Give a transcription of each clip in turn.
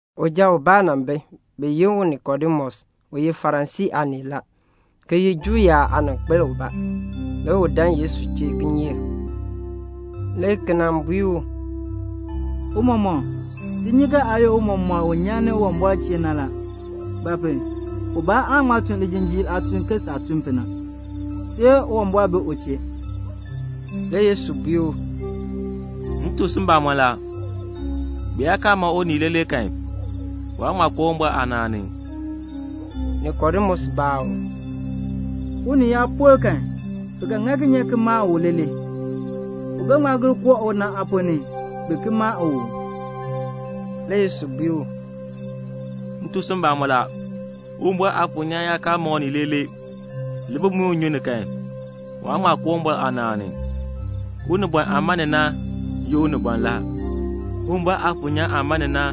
Uja ubaa nan bi, bi yi u Nikodemus, u ye Farisii aanii la, ki ye Juu yaab aaninkpil ubaa. Le u dan Yesu chee kinyeek, le ki nan bui u, "Tiicha, ti nyi ke aa ye tiicha u nyan ni Uwumbɔr chee na la; ba pu? ubaa aan ŋma tun lijinjiir aatun ke saah tun pu na, see Uwumbɔr bi u chee." Le Yesu bui u, "M tuk si mbamɔn la, bi yaa kaa ma unii leelee kan, waan ŋma koo Uwumbɔr aanaan ni." Nikodemus baa u, "Unii yaa por kan, bi ga ŋa kinye ki ki ma u leelee? U ga ŋma gir koo una aaponn ni, bin ki ma u uu?" Le Yesu bui u, "M tuk si mbamɔn la, Uwumbɔr Aafuur nyaan yaa kaa ma unii leelee, le bi muin u nnyun ni kan, waan ŋma koo Uwumbɔr aanaan ni. Unibɔn aah ma ni na ye unibɔn la. Uwumbɔr Aafuur nyaan aah ma ni na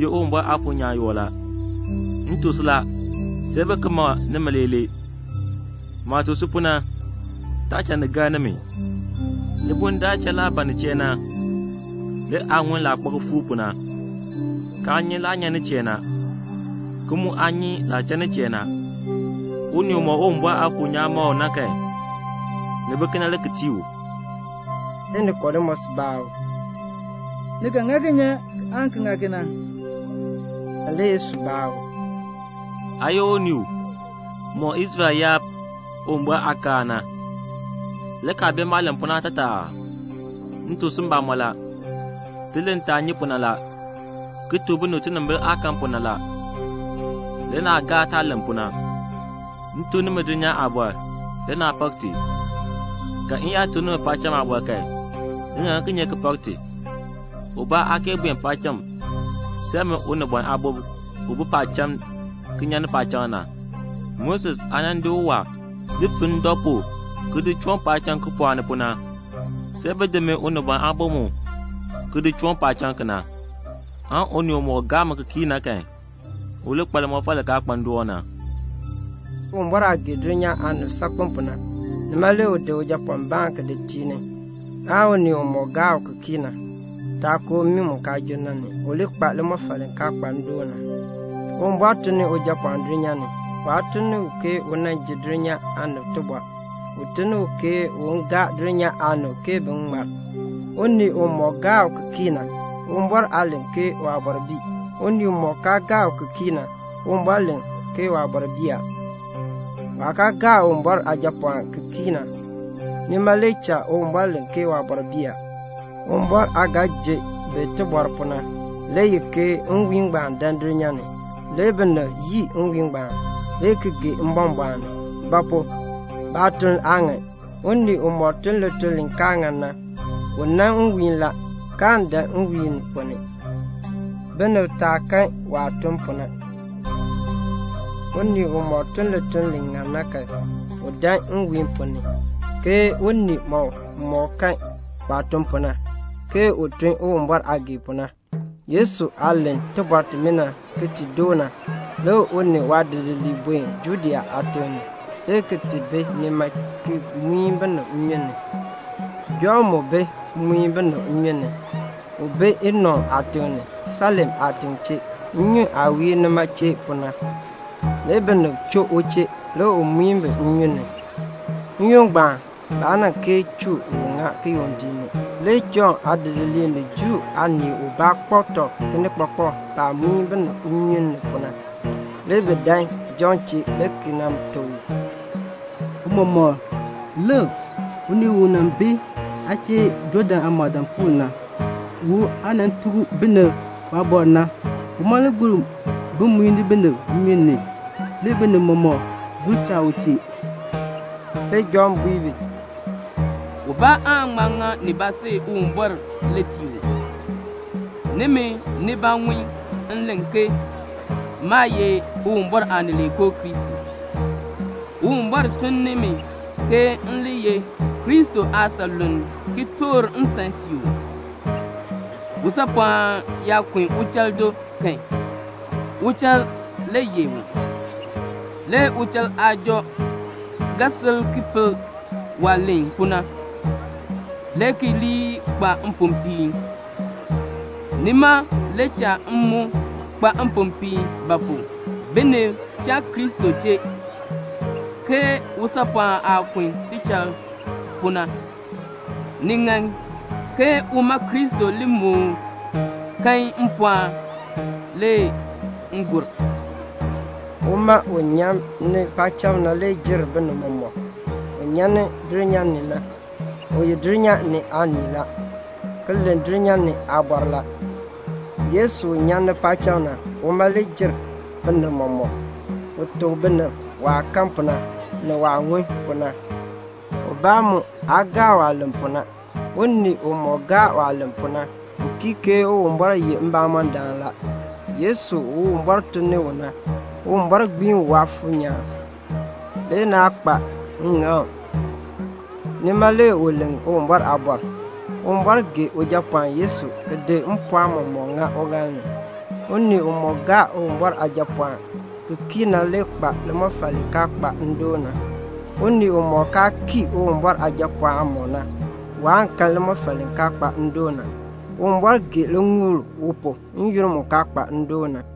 ye Uwumbɔr Aafuur nyaan yoo la. M tuk si la, see bi ki ma nimi leelee. Maah tuk si pu na, taa cha ni gar nimi. Libuln daar cha laah ban nin chee na, le aa ŋun laah kpa kifuuk pu na, kaa nyi laah nyan nin chee na, ki mu aa nyi laah cha nin chee na. Unii umɔk Uwumbɔr Aafuur nyaan ma u na kan, ni bi kena le ki tii u." Le Nikodemus baa u, "Ni ga ŋa kinye aan ki ŋa kena?" Le Yesu baa u, "Aa ye unii u mɔk Israel yaab Uwumbɔr aakaal na, le kaa bee maah len pu na aatataa aa? M tuk si mbamɔn la, ti len taah nyi pu na la, ki tuk binib tinimbil aah kan pu na la, le naa gaa taah len pu na. M tuk nimi dulnyaa aabɔr, le naa pak ti, ka m yaa tuk nimi paacham aabɔr kan, ni ga ŋa kinye ki pak ti? Ubaa aa kee buen paacham see min Unibɔn Aabo u bi paacham ki nyan ni paacham na. Moses aah nan di uwaa di fin ndɔ pu ki di chɔɔn paacham kipɔɔk ni pu na, see bi di min Unibɔn Aabo mu ki di chɔɔn paacham kena, aan unii umɔk gaa mi ki kii na kan, u li kpa limɔfal li kaa kpa ndoon na." Uwumbɔr aah gee dulnyaa aanib saakpen pu na, nima le u di Ujapɔɔnbaan ki di tii ni, aan unii umɔk gaa u ki kii na taa koo mmii mu kaan junn na ni, u li kpa limɔfal li kaa kpa ndoon na. Uwumbɔr tun ni Ujapɔɔn dulnyaa ni. Waa tun ni u ke u nan ji dulnyaa aanib tibɔr. U tun ni u ke un gaa dulnyaa aanib ke bin ŋmar. Unii umɔk gaa u ki kii na, Uwumbɔr aa len ke waabɔr bii. Unii umɔk kaa gaa u ki kii na, Uwumbɔr len ke waabɔr bii a. Waah kaa gaa Uwumbɔr Aajapɔɔnbaan ki kii na, nima le cha Uwumbɔr len ke waabɔr bii a. Uwumbɔr aah ga ji bi tibɔr pu na le ye ke nwiihn ngbaan dan dulnyaa ni, le binib yii nwiihn ngbaan, le ki gee mbɔmbɔɔn ni; ba pu? baatuln aa ŋan. Unii umɔk tun lituln li kaa ŋan na, u nan nwiihn la, kaan dan nwiihn ponn ni, binib taa kan waah tun pu na. Unii umɔk tun lituln li ŋan na kan, u dan nwiihn ponn ni, ke unii mɔmɔk kan waah tun pu na, ke u tun Uwumbɔr aah gee pu na. Yesu aah len tibɔr timina ki ti doo na, le u ni waadidiliib buen Judea aatiŋ ni, le ki ti bi nima ki muin binib nnyun ni. Jɔnn mu bi muin binib nnyun ni. U bi Enon aatiŋ ni, Salim aatiŋ chee, nnyun aah wiir nima chee pu na. Le binib choo u chee, le u muin bi nnyun ni. (N-yoonn ngbaan, baa nan kee chuu u ŋa kiyondiik ni.) Le Jɔnn aadidiliib ni Juu aanii ubaa kpak tɔb kinikpakpak baah muin binib nnyun ni pu na. Le bi dan Jɔnn chee le ki nan tuk u, "Tiicha, lik, unii u nan bi aa chee Jɔɔdan aamɔɔdaapuul na, u aa nan tuk binib waabɔr na, uma le gur bi muini binib nnyun ni, le binib mɔmɔk gur cha u chee." Le Jɔnn bui bi, "Ubaa aan ŋma ŋa nibaa see Uwumbɔr le tii u. Nimi nibaa ŋun m len ke maa ye Uwumbɔr Aanileekoo Kristo; Uwumbɔr tun ni mi ke m li ye Kristo aasanluln ki toor nsan tii u. Usaapɔɔn yaa kun uchal do kan, uchal le yeh u. Le uchal aajɔ ga sil ki pel waah len pu na, le ki li kpa mpopiin. Nima le cha m mu kpa mpopiin; ba pu? binib cha Kristo chee, ke usaapɔɔn aah kun tichal pu na. Ni ŋan ke uma Kristo li moo kan mpɔɔn, le m gur." Uma u nyan ni paacham na le jer binib mɔmɔk. Un nyan ni dulnyaa ni na, u ye dulnyaa ni aanii la, ki len dulnyaa ni aaliin la. Yesu u nyan ni paacham na, uma le jer binib mɔmɔk. U tuk binib waah kan pu na, ni waah ŋun pu na. Ubaa mu aa gaa waah len pu na. Unii umɔk gaa waah len pu na, u kii ke Uwumbɔr ye mbamɔndaan la. Yesu u Uwumbɔr tun ni u na, Uwumbɔr gbiin u Mfuur nyaan, le naa kpa ŋŋaŋ, nima le u len Uwumbɔr aabɔr. Uwumbɔr gee Ujapɔɔn Yesu ki di mpɔɔn mɔmɔk ŋa uŋaal ni. Unii umɔk gaa Uwumbɔr Aajapɔɔn ki kii na le kpa limɔfal li kaa kpa ndoon na. Unii umɔk kaa kii Uwumbɔr Aajapɔɔn aamɔb na, waan kan limɔfal li kaa kpa ndoon na. Uwumbɔr gee liŋuul u pu n-yoonn mu kaa kpa ndoon na.